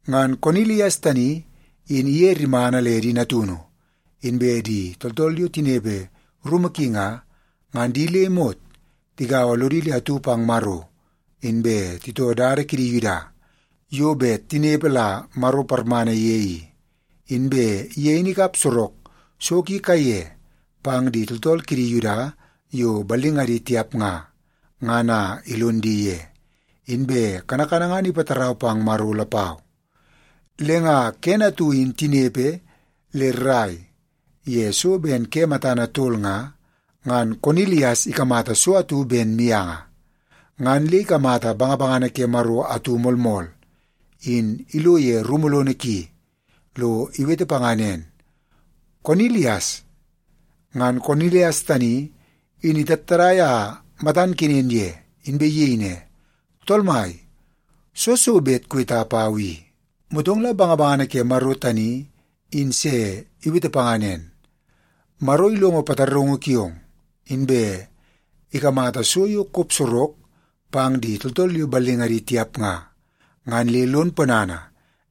Ngan Konilias tani in iye rimana le di natunu, inbe di tooltool yo tinepe rumu ki nga, ngan di le imot tigaua lodi le atu pang Maro, inbe titoo dada kidi Yuda yo bet tinepe la Maro parmana ye i. Inbe ye in ikap sorok so ki kaiye pang di tooltool kidi Yuda yo ballingadi tiap nga, ngan a ilon di ye. Inbe kanakana ngan ipatarau pang Maro lapau. Le nga kene atu in tinepe le rrai ye so ben ke matana tol nga, ngan Konilias ikamata so atu ben mianga. Ngan le ikamata bangabangana ke Maro atu moolmool in ilo ye rumu lono ki lo iwete panga nen, “Konilias!” Ngan Konilias tani in itattadai a matan kenen ye, inbe iyei ne, “Tool mai, soo so bet kuweta pau i?” Motong la bangabangana ke Maro tani in se iwete panga nen, “Maro ilongo pataraungu kiong, inbe ikamata so yo kop sorok pang di tooltool yo ballingadi tiap nga, ngan le lon ponana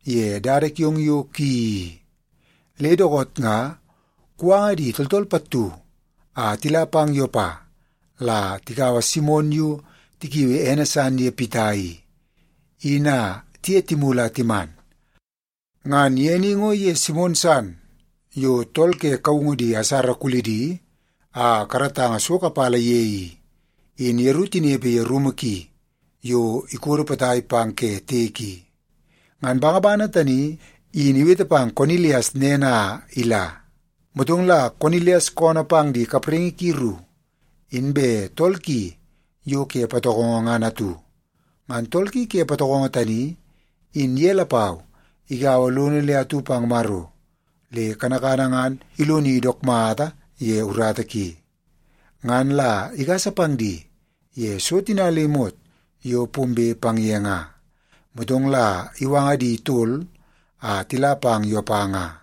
ye dada kiong yo kuyeii i. Le dookoot nga kuwanga di tooltool pattu a tila pang Yopa la tikaua Simon yo tikiui ene san ye Pita i, in a tiye timulu a timan. Ngan ye ni ngo iye Simon san yo tool ke kaungu di asara kulidi a karatanga so kapala ye i, in yeru tinepe ye rumu ki yo ikodo potai pang ke tiek i.” Ngan bangabangana tani in iwete pang Konilias nen a ila. Motong la Konilias koonoo pang di kapraingi ki ru, inbe tool ki yo ke patokongo ngan atu. Ngan tool ki ke patokongo tani, in ye lapau igaua lono le atu pang Maro, le kanakana ngan iloni dook mata ye urata ki. Ngan la igasa pang di ye so tina le imot yo pombe pang ye nga, motong la iwanga di tol a tila pang Yopa nga.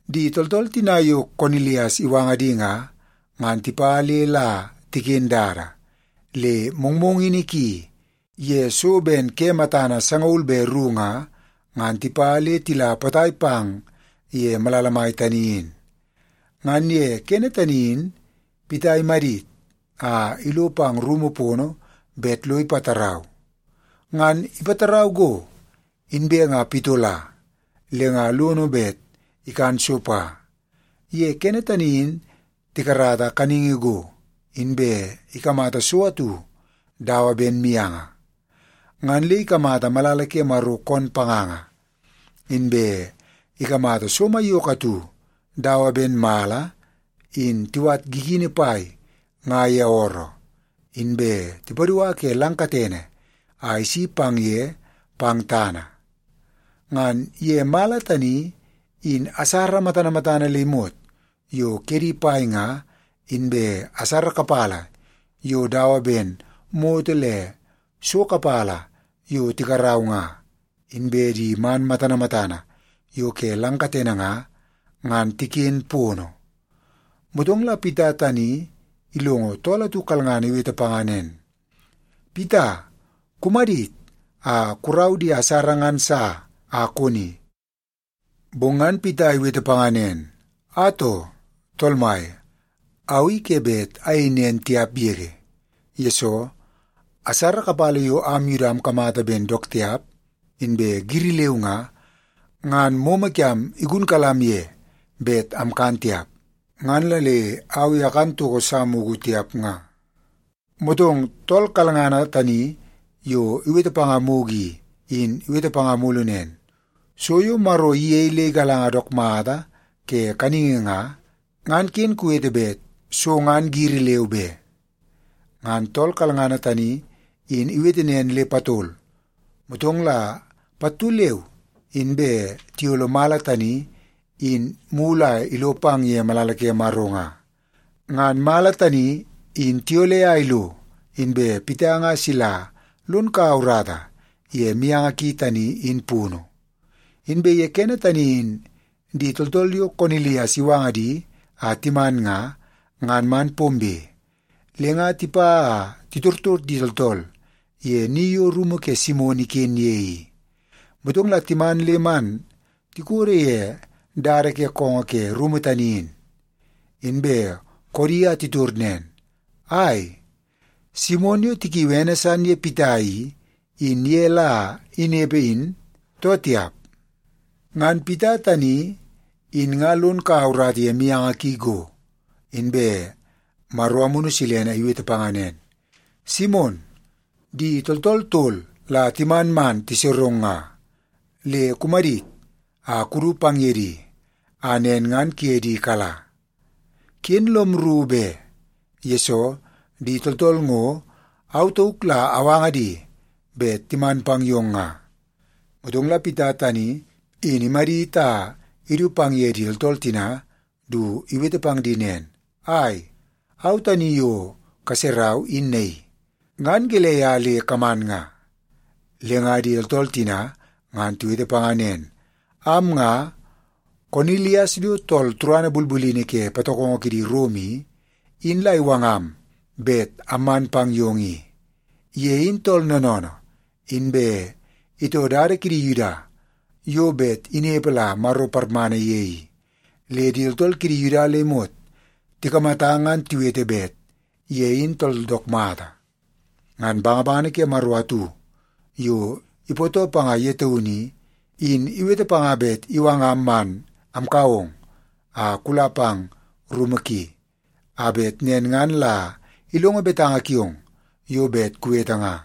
Di tooltool tina yo Konilias iwanga di nga, ngan tipa le la tiken dada. Le mongmongini ki ye so ben ke matana sangaul be ru nga, ngan tipa le tila potai pang ye malala mai tani in. Ngan ye kene tani in Pita imadit a ilo pang rumu pono bet lo ipatarau. Ngan ipatarau go, inbe nga pitola le nga lono bet ikan so pa. Ye kene tani in tikarata kaningi go, inbe ikamata so atu dawa ben mianga. Ngan le ikamata malala ke Maro koon panganga, inbe ikamata so maiyoko atu dawa ben mala in tiwat gigini pai nga ye ooroo, inbe tipadua ke lang katene a isi pang ye pang tana. Ngan ye mala tani, in asara matana matana le imot yo kedi pai nga, inbe asara kapala yo dawa ben moto le so kapala yo tikarau nga, inbe di man matana matana yo ke lang katene nga, ngan tiken pono. Motong la Pita tani ilongo tool atu kalngana iwete panga nen, “Pita, kumadit a kurau di asara ngan sa a koni.” Bong ngan Pita iwete panga nen, “Atoo, Tool Mai! Au i ke bet ayei nen tiap yege, yesoo asara kapala yo am Yuda amkamata ben dook tiap inbe giri leu nga, ngan momo kiam igunkalam ye bet amkan tiap. Ngan la le au i akan toko sa mugu tiap nga.” Motong tool kalngana tani yo iwete panga mugu i, in iwete panga mulu nen, “So yo Maro iyei le igalanga dook mata ke kaningi nga, ngan ken kuwete bet so ngan giri leu be.” Ngan tool kalngana tani in iwete nen le patol, motong la pattu leu inbe tiyolo mala tani in mulu a ilo pang ye malala ke Maro nga. Ngan mala tani in tiyole a ilo, inbe Pita nga sila lon kaua urata ye mianga ki tani in punu. Inbe ye kene tani in di tooltool yo Konilias iwanga di a timan nga, ngan man pombe. Le nga tipa a titortor di tooltool ye ni yo rumu ke Simon iken ye i, motong la timan le man tikodo ye dada ke koongoo ke rumu tani in. Inbe koodi a titor nen, “Ai, Simon yo tikiui ene san Pita i, in ye la inepe in, too tiap?” Ngan Pita tani in nga lon kaua urata ye mianga ki go, inbe Maro Amunu Silene iwete panga nen, “Simon, di tooltool tol la timan man tiserong nga. Le kumadit a kudu pang ye di, a nen ngan kuye di kala. Ken lom rru be, yesoo di tooltool ngo au tauk la awanga di bet timan pang yong nga.” Motong la Pita tani in imadit a idu pang ye di tooltool tina du iwete pang di nen, “Ai, au tani yo kaserau in naii. Ngan gelei a le kaman nga?” Le nga di tooltool tina ngan tiwete panga nen, “Am nga, Konilias yo tool turana bulbulini ke patokongo kidi Rom i, in la iwangam bet amman pang yong i. Ye in tool noonoonoo, inbe itoo dada kidi Yuda yo bet inepe la Maro parmana ye i, le di tooltool kidi Yuda le imot tikamata ngan tiwete bet ye in tool dook mata. Ngan bangabangana ke Maro atu, yo ipootoo panga ye taunu i, in iwete panga bet iwangam man amkau ong a kula pang rumu ki, a bet nen ngan la ilongo betanga kiong yo bet kuwete nga.”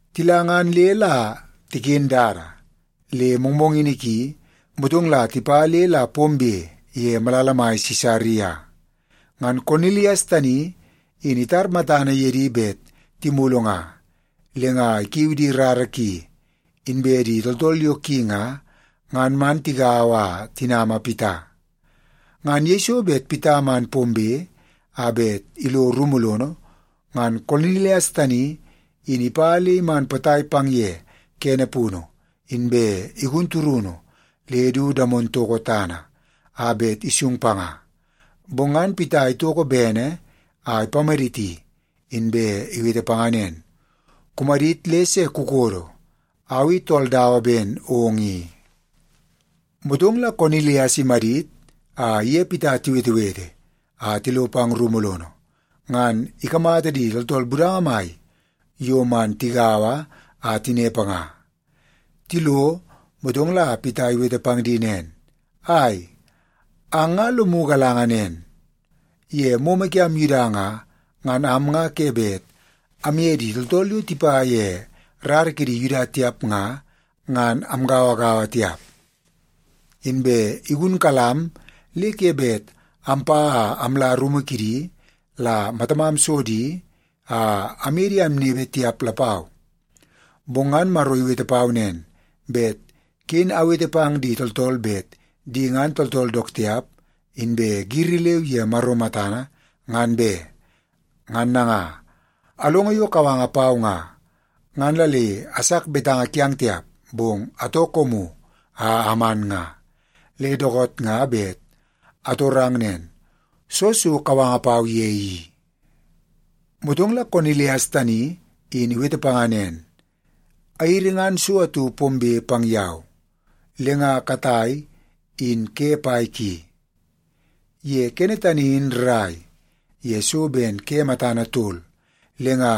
Tila ngan le la tiken dada, le mongmongini ki, motong la tipa le la pombe ye malala mai Sisaria. Ngan Konilias tani in itar matana ye di bet timulu nga, le nga ikiu di rara ki, inbe di tooltool yo ki nga, ngan man tigaua a tinama Pita. Ngan yeiso bet Pita man pombe a bet ilo rumu lono, ngan Konilias tani in ipa le iman potai pang ye kene punu, inbe igun turunu le du damon toko tana, a bet isung panga. Bong ngan Pita itoko bene a ipamaditi, inbe iwete panga nen, “Kumadit le se kukodo. Au i tool dawa ben ong i.” Motong la Konilias imadit a iye Pita tiwetewete a tilo pang rumu lono, ngan ikamata di tooltool budanga mai yo man tigaua a tinepe nga. Tilo, motong la Pita iwete pang di nen, “Ai, ang nga lomu galanga nen, ye momo kiam Yuda nga, ngan am nga ke bet amye di tooltool yo tipa ye rara kidi Yuda tiap nga, ngan amgauagaua tiap. Inbe igunkalam le ke bet ampa a amla rumu kidi la matamam so di a amye di amnepe tiap lapau. Bong ngan Maro iwete pau nen, bet ken awete pang di tooltool bet di ngan tooltool dook tiap inbe giri leu ye Maro matana, ngan be. Ngan nanga, alongo yo kawanga pau nga, ngan la le asak betanga kiang tiap, bong atoo koomu a aman nga. Le dookoot nga bet atorang nen, soo so kawanga pau ye i?” Motong la Konilias tani in iwete panga nen, “Airi ngan so atu pombe pang yau, le nga katai in ke pai ki. Ye kene tani in rrai ye so ben ke matana tol, le nga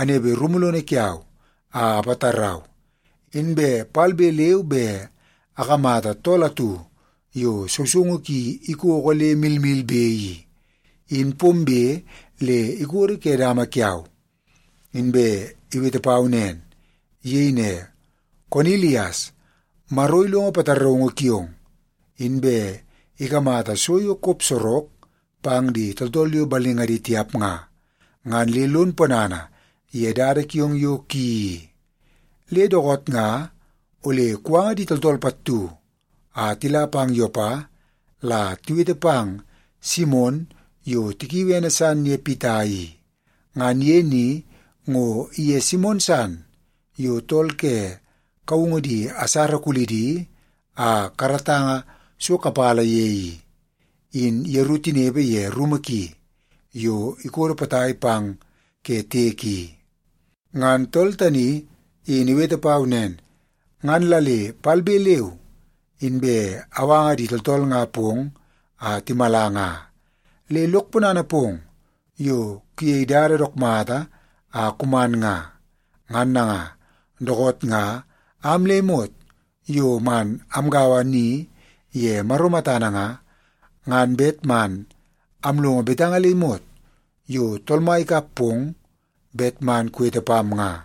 anepe rumu lono kiau a apatarau, inbe palbe leu be akamata tool atu yo sousoungu ki ikoko le milmilbe i, in pombe le ikodo ke dama kiau, inbe iwete pau nen. Iyei ne, ‘Konilias! Maro ilongo pataraungu kiong, inbe ikamata so yo kop sorok pang di tooltool yo ballingadi tiap nga, ngan le lon ponana ye dada kiong yo kuyeii i. Le dookoot nga ole kuwanga di tooltool pattu a tila pang Yopa la tiwete pang Simon yo tikiui ene san Pita i. Ngan ye ni ngo iye Simon san yo tool ke kaungu di asara kulidi a karatanga so kapala ye i, in yeru tinepe ye rumu ki yo ikodo potai pang ke tiek i.’ Ngan tool tani in iwete pau nen, ngan la le palbe leu inbe awanga di tooltool nga pong a timala nga. Le lok ponana pong yo kuyei dada dook mata a kuman nga. Ngan nanga, dookoot nga am le imot yo man amgaua ni ye Maro matana nga, ngan bet man amlongo betanga le imot yo Tool Mai ikap pong bet man kuwete pam nga.”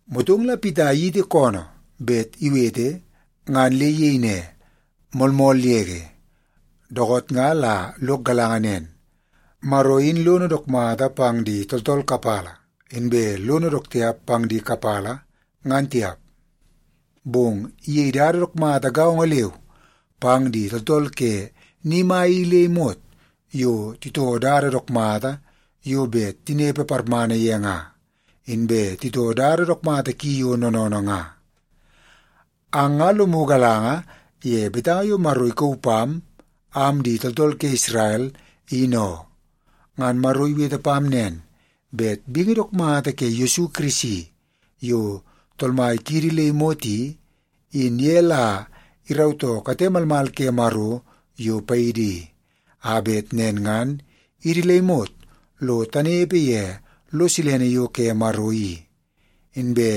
Motong la Pita iyiti koonoo bet iwete ngan le iyei ne, “Moolmool yege, dookoot nga la lok galanga nen, Maro in lono dook mata pang di tooltool kapala, inbe lono dook tiap pang di kapala, ngan tiap. Bong iyei dada dook mata gaongo leu pang di tooltool ke ni mai i le imot yo titoo dada dook mata yo bet tinepe parmana ye nga, inbe titoo dada dook mata ki yo noonoonoo nga. Ang nga lomu galanga ye betanga yo Maro ikauu pam, am di tooltool ke Isrel, in oo. Ngan Maro iwete pam nen, bet bingi dook mata ke Yesu Kirisi yo Tool Mai kiidi le imot i, in ye la irautoo kate malmal ke Maro yo paidi i, a bet nen ngan idi le imot lo tanepe ye lo silene yo ke Maro i. Inbe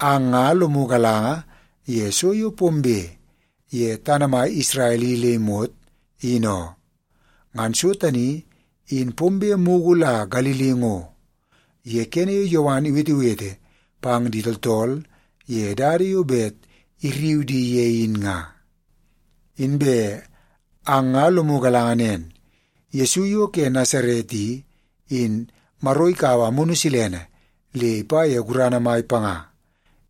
ang nga lomu galanga ye so yo pombe ye tana mai Isrel i le imot, in oo. Ngan so tani in pombe mugu la Galili ngo, ye kene yo Yowan iwetewete pang di tooltool ye dada yo bet irriu di ye in nga. Inbe ang nga lomu galanga nen, Yesu yo ke Nasaret i, in Maro ikaua Amunu Silene le ipa ye gurana mai panga.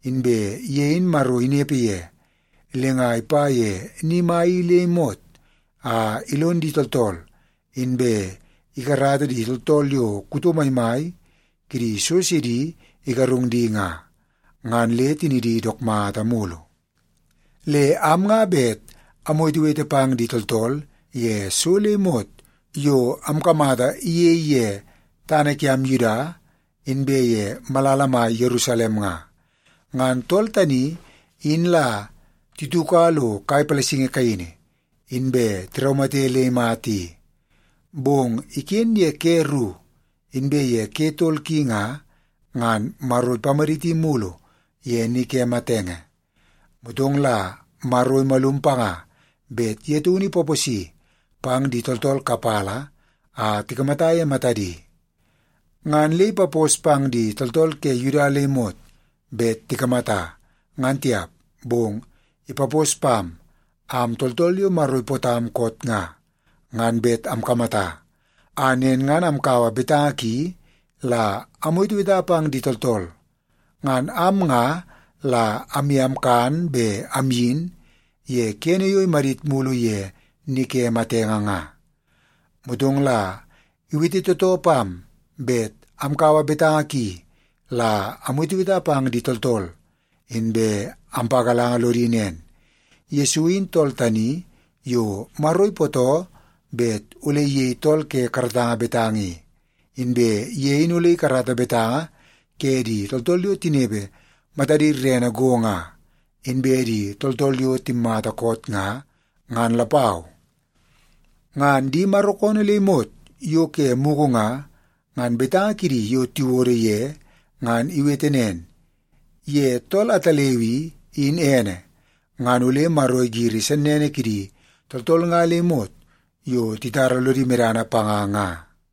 Inbe ye in Maro inepe ye, le nga ipa ye ni mai i le imot a ilon di tooltool, inbe ikarata di tooltool yo tool kuto mai kidi so sidi igarung di nga, ngan le tinidi dook mata mulu. “Le am nga bet amwetewete pang di tooltool ye so le imot yo amkamata iyei ye tana kiam Yuda, inbe ye malala mai Yerusalem nga. Ngan tool tani in la tituka lo kai palasingi kaini, inbe tiraumate le imata i. Bong iken ye ke ru, inbe ye ke tol ki nga, ngan Maro ipamaditi mulu ye ni ke matenge. Motong la Maro imalum panga bet ye taunu ipaposi pang di tooltool kapala a tikamata ye matadi. Ngan le ipapos pang di tooltool ke Yuda le imot bet tikamata, ngan tiap, bong ipapos pam, am tooltool yo Maro ipootam koot nga, ngan bet amkamata, a nen ngan amkaua betanga ki la amweteweta pang di tooltool. Ngan am nga la amye amkan be amyin, ye kene yo imadit mulu ye ni ke matenge nga. Motong la iwete tootoo pam bet amkaua betanga ki la amweteweta pang di tooltool, inbe ampagalanga lodi nen, ‘Yesu in tool tani yo Maro ipootoo bet ole iyei tool ke karatanga betanga i, inbe ye in ole ikarata betanga ke di tooltool yo tinepe matadi rerene go nga, inbe di tooltool yo timmata koot nga, ngan lapau.’ Ngan di Maro koonoo le imot yo ke mugu nga, ngan betanga kidi yo tiwodo ye ngan iwete nen, ‘Ye tool ataleu i, in ene, ngan ole Maro igiri sennene kidi tooltool nga le imot yo titara lodi medana panga nga.’”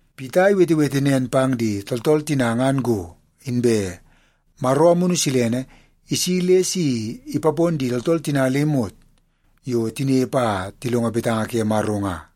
Pita iwetewete nen pang di tooltool tina ngan go, inbe Maro Amunu Silene isi le si ipapon di tooltool tina le imot yo tinepe a tilongo betanga ke Maro nga.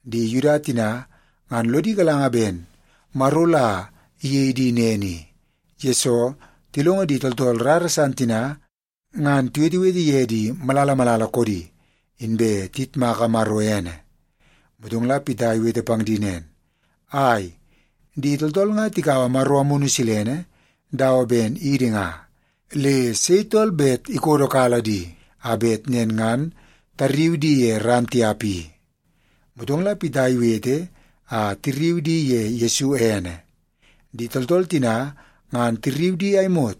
Di Yuda tina ngan lodi galanga ben Maro la iyei di nen i, yesoo tilongo di tooltool rara san tina ngan tiwetewete ye di malala malala koodi, inbe tiyitmaka Maro ene. Motong la Pita iwete pang di nen, “Ai, di tooltool nga tikaua Maro Amunu Silene dawa ben idi nga. Le sei tool bet ikodokala di, a bet nen ngan tarriu di ye ran tiap i?” Motong la Pita iwete a tirriu di ye Yesu Kirisi ene. Di tooltool tina ngan tirriu a imot,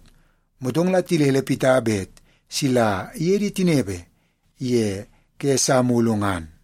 motong tilele Pita bet sila iye di tinepe ye ke sa mulu ngan.